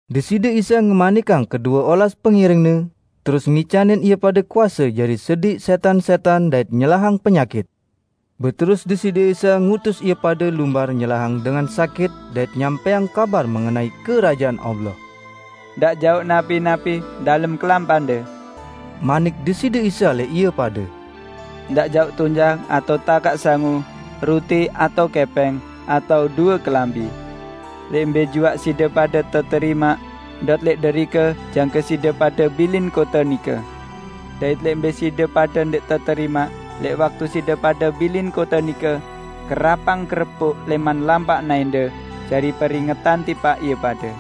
Deside Isa ngemanikang kedue olas pengiring-Ne, terus ngicanin ie pade kuase jari sediq sẽtan-sẽtan dait nyelahang penyakit. Beterus Deside Isa ngutus ie pade lumbar nyelahang dengan sakit dait nyampẽang kabar mengenai Kerajaan Allah. "Ndaq jauq napi-napi dalem kelampande," manik Deside Isa lẽq ie pade. "Ndaq jauq tunjang, atao takaq sangu, ruti atao kẽpẽng, atao due kelambi. Lẽq mbẽ juaq side pade teterimaq, ndot lẽq derike jangke side pade bilin kote nike. Dait lẽq mbẽ side pade ndẽq teterimaq, lẽq waktu side pade bilin kote nike, kerapang kerepuk lẽman lampak naẽnde jari peringetan tipaq ie pade."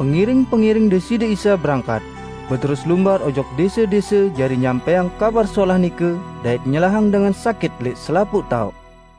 Pengiring-pengiring Deside Isa berangkat, beterus lumbar ojok dẽse-dẽse jari nyampẽang Kabar Solah nike dait nyelahang dengan sakit lẽq selapuq taoq.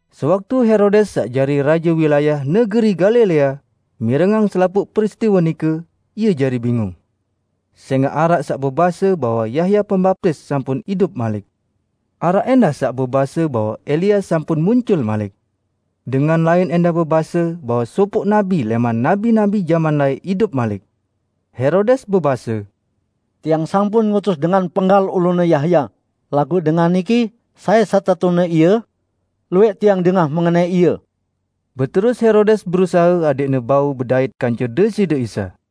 Sewaktu Herodes saq jari raje wilayah negeri Galilea, mirengang selapuq peristiwe nike, ie jari bingung. Sẽngaq araq saq bebase bahwe Yahya Pembaptis sampun idup malik. Araq ẽndah saq bebase bahwe Elia sampun muncul malik. Dengan lain ẽndah bebase bahwe sopoq nabi lẽman nabi-nabi jaman laẽq idup malik. Herodes bebase, "Tiang sampun ngutus dengan penggal ulune Yahya. Laguq Dengan niki, sai setetune Ie? Luwẽq tiang dengah mengenai Ie." Beterus Herodes berusahe adẽqne bau bedait kance Deside Isa.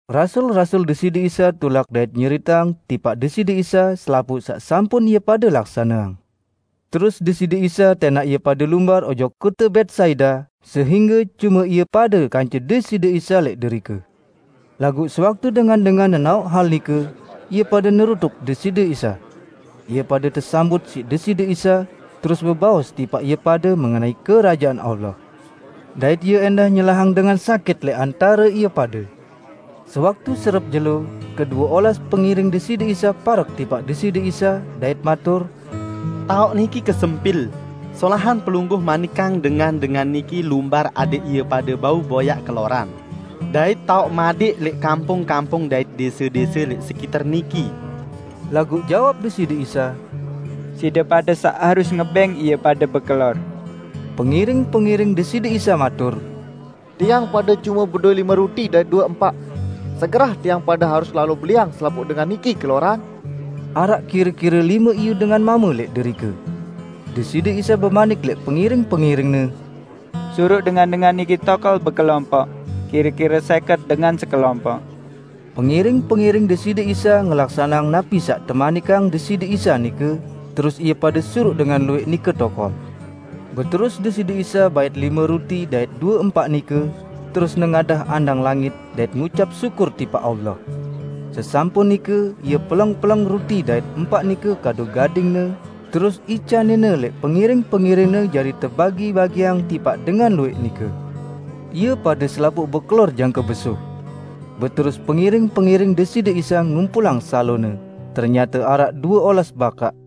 Rasul-rasul Deside Isa tulak dait nyeriteang tipaq Deside Isa selapuq saq sampun ie pade laksaneang. Terus Deside Isa tẽnaq ie pade lumbar ojok kote Betsaida sehingge cume ie pade kance Deside Isa lẽq derike. Laguq sewaktu dengan-dengan nenaoq hal nike, ie pade nerutuk Deside Isa. Ie pade tesambut siq Deside Isa, terus bebaos tipaq ie pade mengenai Kerajaan Allah. Dait Ie ẽndah nyelahang dengan sakit lẽq antare ie pade. Sewaktu serep jelo, kedue olas pengiring Deside Isa parek tipaq Deside Isa dait matur, "Taoq niki kesempil, solahan Pelungguh manikang dengan-dengan niki lumbar adẽq ie pade bau boyaq keloran dait taoq madẽq lẽq kampung-kampung dait dẽse-dẽse lẽq sekiter niki." Laguq jawab Deside Isa, "Side pade saq harus ngebẽng ie pade bekelor." Pengiring-pengiring Deside Isa matur, "Tiang pade cume bedowẽ lime ruti dait due empaq. Segerah tiang pade harus lalo beliang selapuq dengan niki keloran?" (Araq kire-kire lime iyu dengan mame lẽq derike.) Deside Isa bemanik lẽq pengiring-pengiring-Ne, "Suruq dengan-dengan niki tokol bekelompoq, kire-kire sẽket dengan sekelompoq." Pengiring-pengiring Deside Isa ngelaksaneang napi saq temanikang Deside Isa nike, terus ie pade suruq dengan luwẽq nike tokol. Beterus Deside Isa bait lime ruti dait due empaq nike, terus nengadah andang langit dait ngucap syukur tipaq Allah. Sesampun nike Ie peleng-peleng ruti dait empaq nike kadu gading-Ne terus icanin-Ne lẽq pengiring-pengiring-Ne jari tebagi-bagiang tipaq dengan luwẽq nike. Ie pade selapuq bekelor jangke besuh. Beterus pengiring-pengiring Deside Isa ngumpulang salone, ternyate araq due olas bakaq.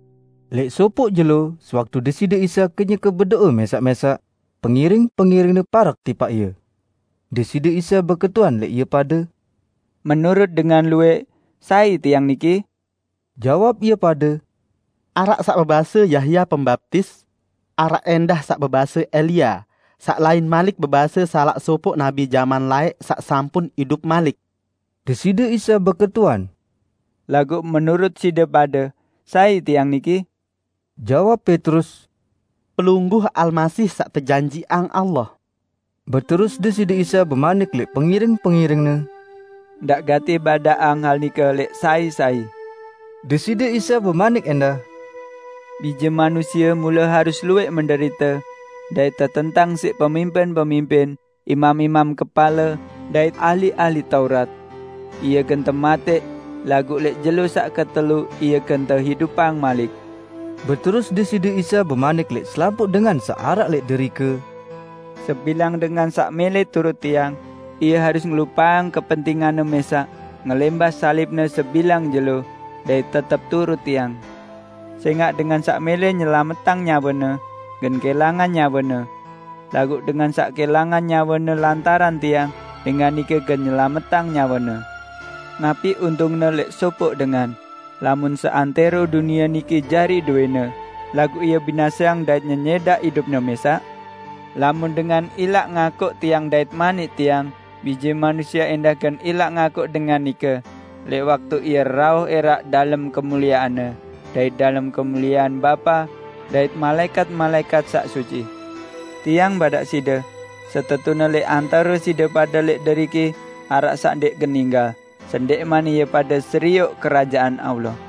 Lẽq sopoq jelo, sewaktu Deside Isa kenyeke bedo'e mẽsaq-mẽsaq, pengiring-pengiring-Ne parek tipaq Ie. Deside Isa beketuan lẽq ie pade, "Menurut dengan luwẽq, sai Tiang niki?" Jawab ie pade, "Araq saq bebase Yahya Pembaptis. Araq ẽndah saq bebase Elia, saq lain malik bebase salaq sopoq nabi jaman laẽq saq sampun idup malik." Deside Isa beketuan, "Laguq menurut side pade, sai Tiang niki?" Jawab Petrus, "Pelungguh Almasih saq tejanjiqang Allah." Beterus Deside Isa bemanik lẽq pengiring-pengiring-Ne, "Ndaq gati badaqang hal nike lẽq sai-sai." Deside Isa bemanik ẽndah, "Bije Manusie mule harus luwẽq menderite dait tetentang siq pemimpin-pemimpin, imam-imam kepale, dait serte ahli-ahli Taurat. Ie gen tematẽq, laguq lẽq jelo saq ketelu Ie gen teidupang malik." Beterus Deside Isa bemanik lẽq selapuq dengan saq araq lẽq derike, "Sebilang dengan saq mẽlẽ turut Tiang, ie harus ngelupaqang kepentinganne mẽsaq, ngelẽmbah salibne sebilang jelo, dait tetep turut Tiang. Sẽngaq dengan saq mẽlẽ nyelametang nyawene, gen kẽlangan nyawene. Laguq dengan saq kẽlangan nyawene lantaran Tiang, dengan nike gen nyelametang nyawene. Napi untungne lẽq sopoq dengan, lamun seantẽro dunie niki jari dowẽne, laguq ie binaseang dait nyenyẽdaq idupne mẽsaq? Lamun dengan ilaq ngakuq Tiang dait manik Tiang, Bije Manusie ẽndah gen ilaq ngakuq dengan nike lẽq waktu Ie rauh ẽraq dalem kemuliean-Ne, dait dalem kemuliean Bapa dait malaẽkat-malaẽkat saq suci! Tiang badaq side: Setetune lẽq antare side pade lẽq deriki araq saq ndẽq gen ninggal, sendẽqman ie pade serioq Kerajaan Allah."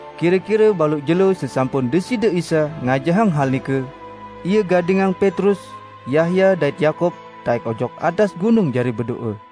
Kire-kire baluq jelo sesampun Deside Isa ngajahang hal nike, Ie gadingang Petrus, Yahya dait Yakub taẽk ojok atas gunung jari bedo'e.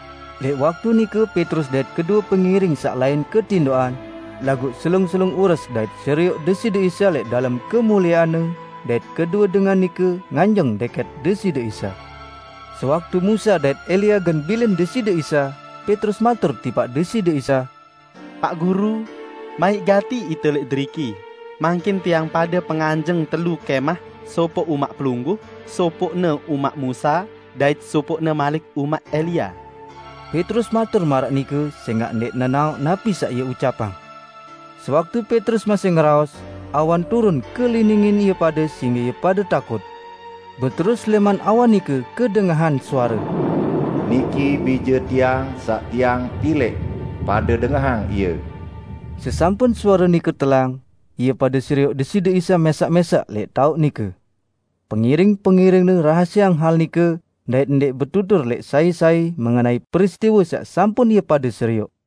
Lẽq waktu nike Petrus dait kedue pengiring saq lain ketindoqan, laguq selung-selung ures dait serioq Deside Isa lẽq dalem kemuliean-Ne dait kedue dengan nike nganjeng dẽkẽt Deside Isa. Sewaktu Musa dait Elia gen bilin Deside Isa, Petrus matur tipaq Deside Isa, "Paq Guru, maiq gati ite lẽq deriki, mangkin tiang pade penganjeng telu kẽmah sopoq umaq Pelungguh, sopoqne umaq Musa dait sopoqne malik umaq Elia." (Petrus matur maraq nike sẽngaq ndẽq nenaoq napi saq ie ucapang.) Sewaktu Petrus masih ngeraos, awan turun keliningin ie pade sehingge ie pade takut. Beterus lẽman awan nike kedengahan suare, "Niki Bije Tiang saq Tiang pilẽq, pade dengahang Ie!" Sesampun suare nike telang, ie pade serioq Deside Isa mẽsaq-mẽsaq lẽq taoq nike. Pengiring-pengiring-Ne rahasieang hal nike dait ndẽq betutur lẽq sai-sai mengenai peristiwe saq sampun ie pade serioq.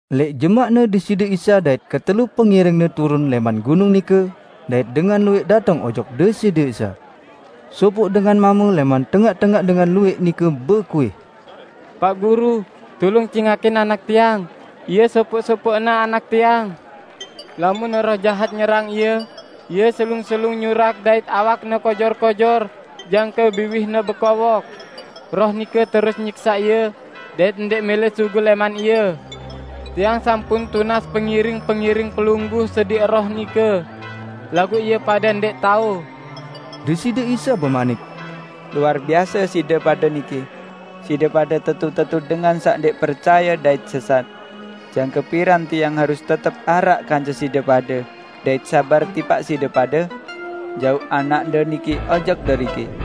Lẽq jemaqne Deside Isa dait ketelu pengiring-Ne turun lẽman gunung nike, dait dengan luwẽq dateng ojok Deside Isa. Sopoq dengan mame lẽman tengaq-tengaq dengan luwẽq nike bekuih, "Paq Guru, tulung cingakin anak tiang -- ie sopoq-sopoqne anak tiang! Lamun roh jahat nyerang ie, ie selung-selung nyurak dait awakne kojor-kojor jangke biwihne bekowok. Roh nike terus nyiksaq ie dait ndẽq mẽlẽ sugul lẽman ie! Tiang sampun tunas pengiring-pengiring Pelungguh sediq roh nike, laguq ie pade ndẽq tao." Deside Isa bemanik, "Luar biase side pade niki! Side pade tetu-tetu dengan saq ndẽq percaye dait sesat. Jangke piran Tiang harus tetep araq kance side pade, dait sabar tipaq side pade? Jauq anakde nike ojok deriki!"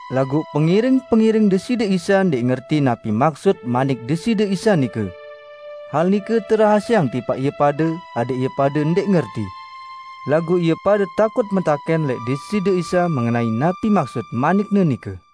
Laguq pengiring-pengiring Deside Isa ndẽq ngerti napi maksut manik Deside Isa nike. Hal nike terahasieang tipaq ie pade adẽq ie pade ndẽq ngerti. Laguq ie pade takut metakẽn lẽq Deside Isa mengenai napi maksud manik-Ne nike.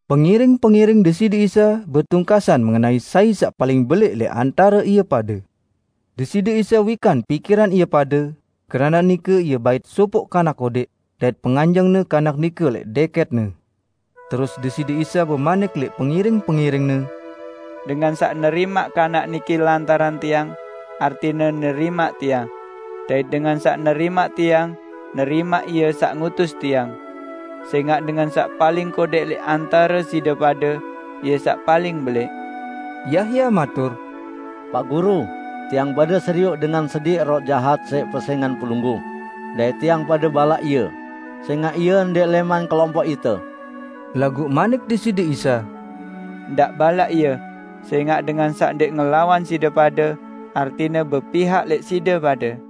Pengiring-pengiring Deside Isa betungkasan mengenai sai saq paling belẽq lẽq antare ie pade. Deside Isa wikan pikiran ie pade, keranaq nike Ie bait sopoq kanak kodẽq, dait penganjeng-Ne kanak nike lẽq dẽkẽt-Ne. Terus Deside Isa bemanik lẽq pengiring-pengiring-Ne, "Dengan saq nerimaq kanak niki lantaran Tiang, artine nerimaq Tiang. Dait dengan saq nerimaq Tiang, nerimaq Ie saq ngutus Tiang. Sẽngaq dengan saq paling kodẽq lẽq antare side pade, ie saq paling belẽq!" Yahya matur, "Paq Guru, tiang pade serioq dengan sediq roh jahat siq pesẽngan Pelungguh, dait tiang pade balaq ie, sẽngaq ie ndẽq lẽman kelompoq ite." Laguq manik Deside Isa, "Ndaq balaq ie, sẽngaq dengan saq ndẽq ngelawan side pade, artine bepihak lẽq side pade."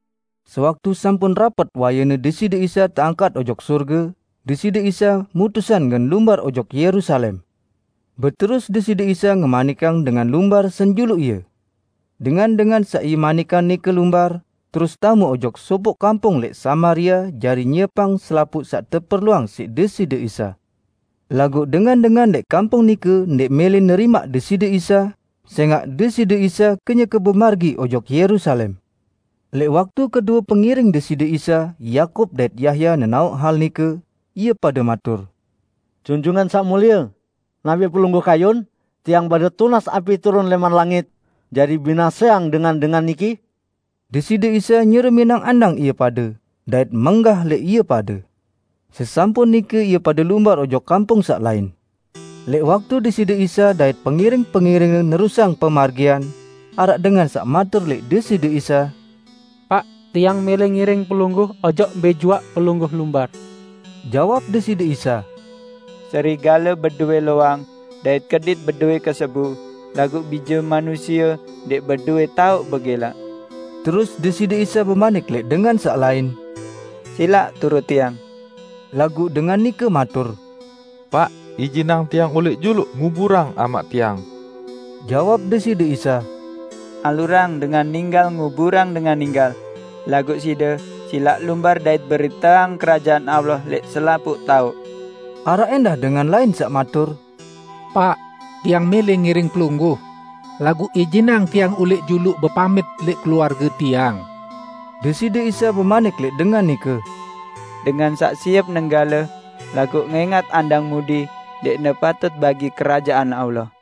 Sewaktu sampun rapet wayene Deside Isa teangkat ojok sorge, Deside Isa mutusang gen lumbar ojok Yerusalem. Beterus Deside Isa ngemanikang dengan lumbar senjuluq Ie. Dengan-dengan saq Ie manikang nike lumbar, terus tame ojok sopoq kampung lẽq Samaria jari nyiepang selapuq saq teperluang siq Deside Isa. Laguq dengan-dengan lẽq kampung nike ndẽq mẽlẽ nerimaq Deside Isa, sẽngaq Deside Isa kenyeke bemargi ojok Yerusalem. Lẽq waktu kedue pengiring Deside Isa, Yakub dait Yahya nenaoq hal nike, ie pade matur, "Junjungan Saq Mulie, napi Pelungguh kayun, tiang pade tunas api turun lẽman langit jari binaseang dengan-dengan niki?" Deside Isa nyereminang andang ie pade, dait menggah lẽq ie pade. Sesampun nike ie pade lumbar ojok kampung saq lain. Lẽq waktu Deside Isa dait pengiring-pengiring-Ne nerusang pemargian, araq dengan saq matur lẽq Deside Isa, "Paq, tiang mẽlẽ ngiring Pelungguh ojok mbẽ juaq Pelungguh lumbar!" Jawab Deside Isa, "Serigale bedowẽ loang, dait kedit bedowẽ kesebu, laguq Bije Manusie ndẽq bedowẽ taoq begẽlaq." Terus Deside Isa bemanik lẽq dengan saq lain, "Silaq turut Tiang." Laguq dengan nike matur, "Paq ijinang tiang ulẽq juluq nguburang amaq tiang." Jawab Deside Isa, "Alurang dengan ninggal nguburang dengan ninggal. Laguq side, silaq lumbar dait beriteang Kerajaan Allah lẽq selapuq taoq." Araq ẽndah dengan lain saq matur, "Paq, tiang mẽlẽ ngiring Pelungguh, laguq ijinang tiang ulẽq juluq bepamit lẽq keluarge tiang." Deside Isa bemanik lẽq dengan nike, "Dengan saq siep nenggale, laguq ngẽngat andang mudi, ndẽqne patut bagi Kerajaan Allah."